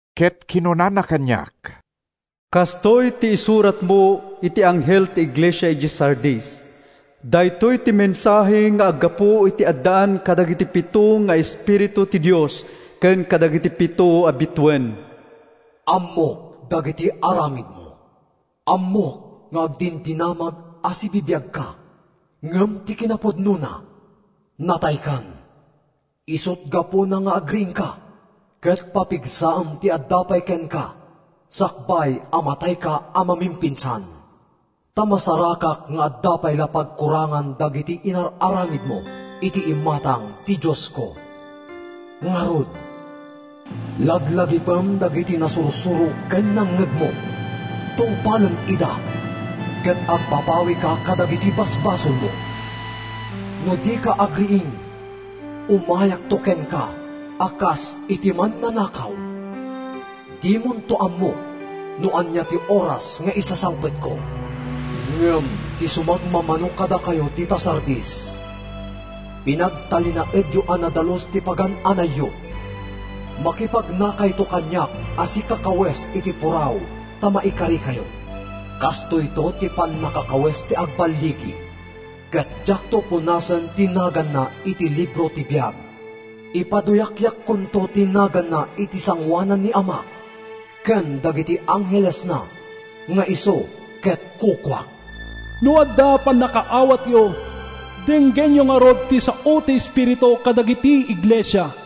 Ket kinunana kaniak, “Kastoy ti isuratmo iti anghel ti iglesia idiay Sardis: “Daytoy ti mensahe nga aggapu iti addaan kadagiti pito nga espiritu ti Dios ken kadagiti pito a bituen: Ammok dagiti aramidmo. Ammok nga agdindinamag a sibibiagka, ngem ti kinapudnona, nataykan! Isut’ gapuna nga agriingka ket papigsaem ti adda pay kenka sakbay a matayka a mamimpinsan. Ta masarakak nga adda pay la pagkurangan dagiti inar-aramidmo iti imatang ti Diosko. Ngarud, laglagipem dagiti nasursuro ken nangngegmo. Tungpalem ida ket agbabawika kadagiti basbasolmo. No dika agriing, umayakto kenka a kas iti mannanakaw—dimonto ammo no ania ti oras nga isasangpetko. “Ngem ti sumagmamano kadakayo dita Sardis, pinagtalinaedyo a nadalus ti pagan-anayyo. Makipagnakayto kaniak a sikakawes iti puraw ta maikarikayo. Kastoyto ti pannakakawes ti agballigi, ket diakto punasen ti naganna iti libro ti biag. Ipaduyakyakkonto ti naganna iti sangoanan ni Amak ken dagiti anghelesna nga isu ket kukuak. “No adda pannakaawatyo, denggenyo ngarud ti sao ti Espiritu kadagiti iglesia.”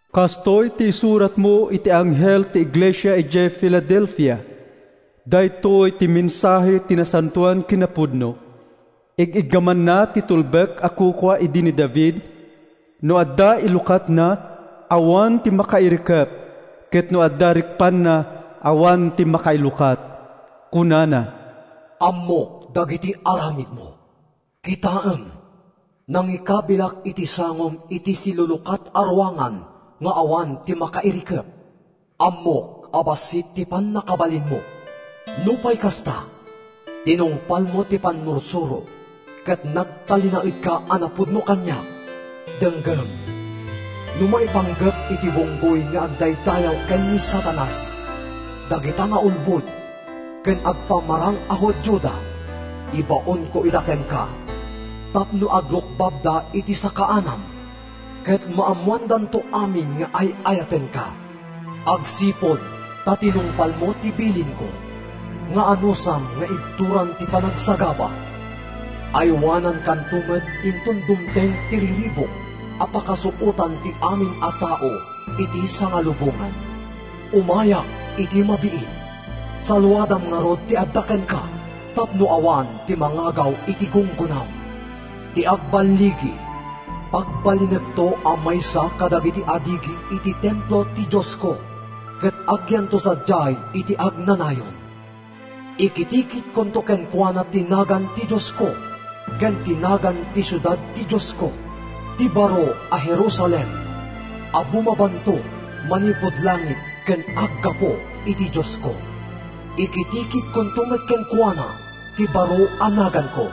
“Kastoy ti isuratmo iti anghel ti iglesia idiay Filadelfia: “Daytoy ti mensahe ti nasantoan ken napudno. Ig-iggamanna ti tulbek a kukua idi ni David. No adda ilukatna, awan ti makairikep, ket no adda rikpanna, awan ti makailukat. Kunana: Ammok dagiti aramidmo. Kitaem, nangikabilak iti sangom iti silulukat a ruangan nga awan ti makairikep. Ammok a bassit ti pannakabalinmo. Nupay kasta, tinungpalmo ti pannursurok ket nagtalinaedka a napudno kaniak. Denggem, no maipanggep iti bunggoy nga agdaydayaw ken ni Satanas, dagita nga ulbod ken agpamarang a Judioda, ibaonko ida kenka tapno agrukbabda iti sakaanam ket maammoandanto amin nga ay-ayatenka. Agsipud ta tinungpalmo ti bilinko, nga anusam nga ibturan ti panagsagaba, aywanankanto met inton dumteng ti riribuk a pakasuotan ti amin a tao iti sangalubongan. Umayak iti mabiit. Saluadam ngarud ti adda kenka tapno awan ti mangagaw iti gunggonam. “Ti agballigi, pagbalinekto a maysa kadagiti adigi iti templo ti Diosko, ket agyanto sadiay iti agnanayon. Ikitikitkonto kenkuana ti nagan ti Diosko ken ti nagan ti siudad ti Diosko, ti baro a Jerusalem a bumabanto manipud langit ken aggapu iti Diosko. Ikitikitkonto met kenkuana ti baro a naganko.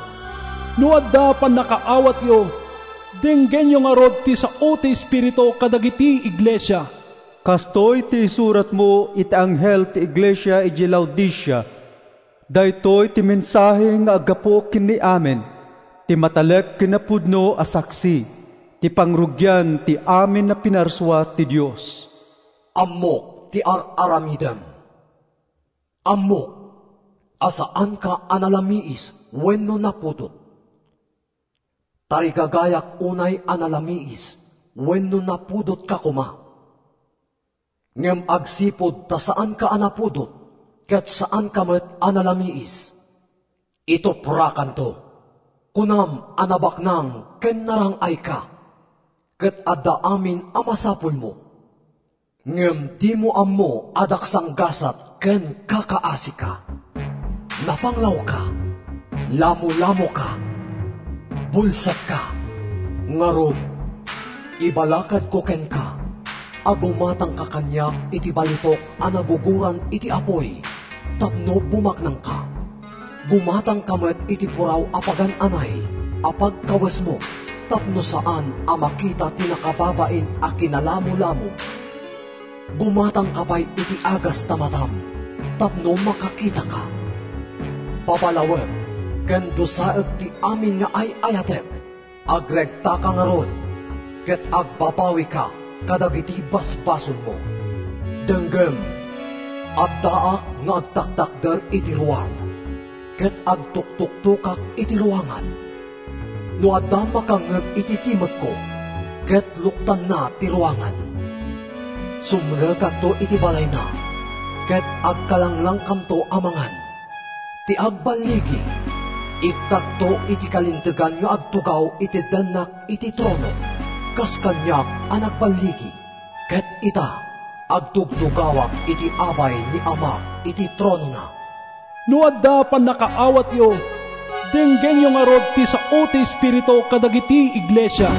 “No adda pannakaawatyo, denggenyo ngarud ti sao ti Espiritu kadagiti iglesia.” “Kastoy ti isuratmo iti anghel ti iglesia idiay Laodicea: “Daytoy ti mensahe nga aggapu ken ni Amen, ti matalek ken napudno a saksi, ti pangrugian ti amin a pinarsua ti Dios: Ammok ti ar-aramidem. Ammok a saanka a nalamiis wenno napudot. Tarigagayak unay a nalamiis wenno napudotka koma. Ngem agsipud ta saanka a napudot ket saanka met a nalamiis, ituprakanto! “Kunam a nabaknang ken narang-ayka ket adda amin a masapulmo. Ngem dimo ammo a daksanggasat ken kakaasika. Napanglawka. Lamolamoka. Bulsekka. Ngarud, ibalakadko kenka a gumatangka kaniak iti balitok a nagugoran iti apuy tapno bumaknangka. Gumatangka met iti puraw a pagan-anay a pagkawesmo tapno saan a makita ti nakababain a kinalamolamom. Gumatangka pay iti agas ta matam tapno makakitaka. Babalawek ken dusaek ti amin nga ay-ayatek. Agregtaka ngarud ket agbabawika kadagiti basbasolmo. Denggem, addaak nga agtatakder iti ruar ket agtuktuktokak iti ruangan. No adda makangngeg iti timekko ket luktanna ti ruangan, sumrekakto iti balayna ket agkalanglangkamto a mangan. “Ti agballigi, ikkakto iti kalintegan nga agtugaw iti dennak iti tronok, kas kaniak a nagballigi, ket ita, agtugtugawak iti abay ni Amak iti tronona. “No adda pannakaawatyo, denggenyo ngarud ti sao ti Espiritu kadagiti iglesia.”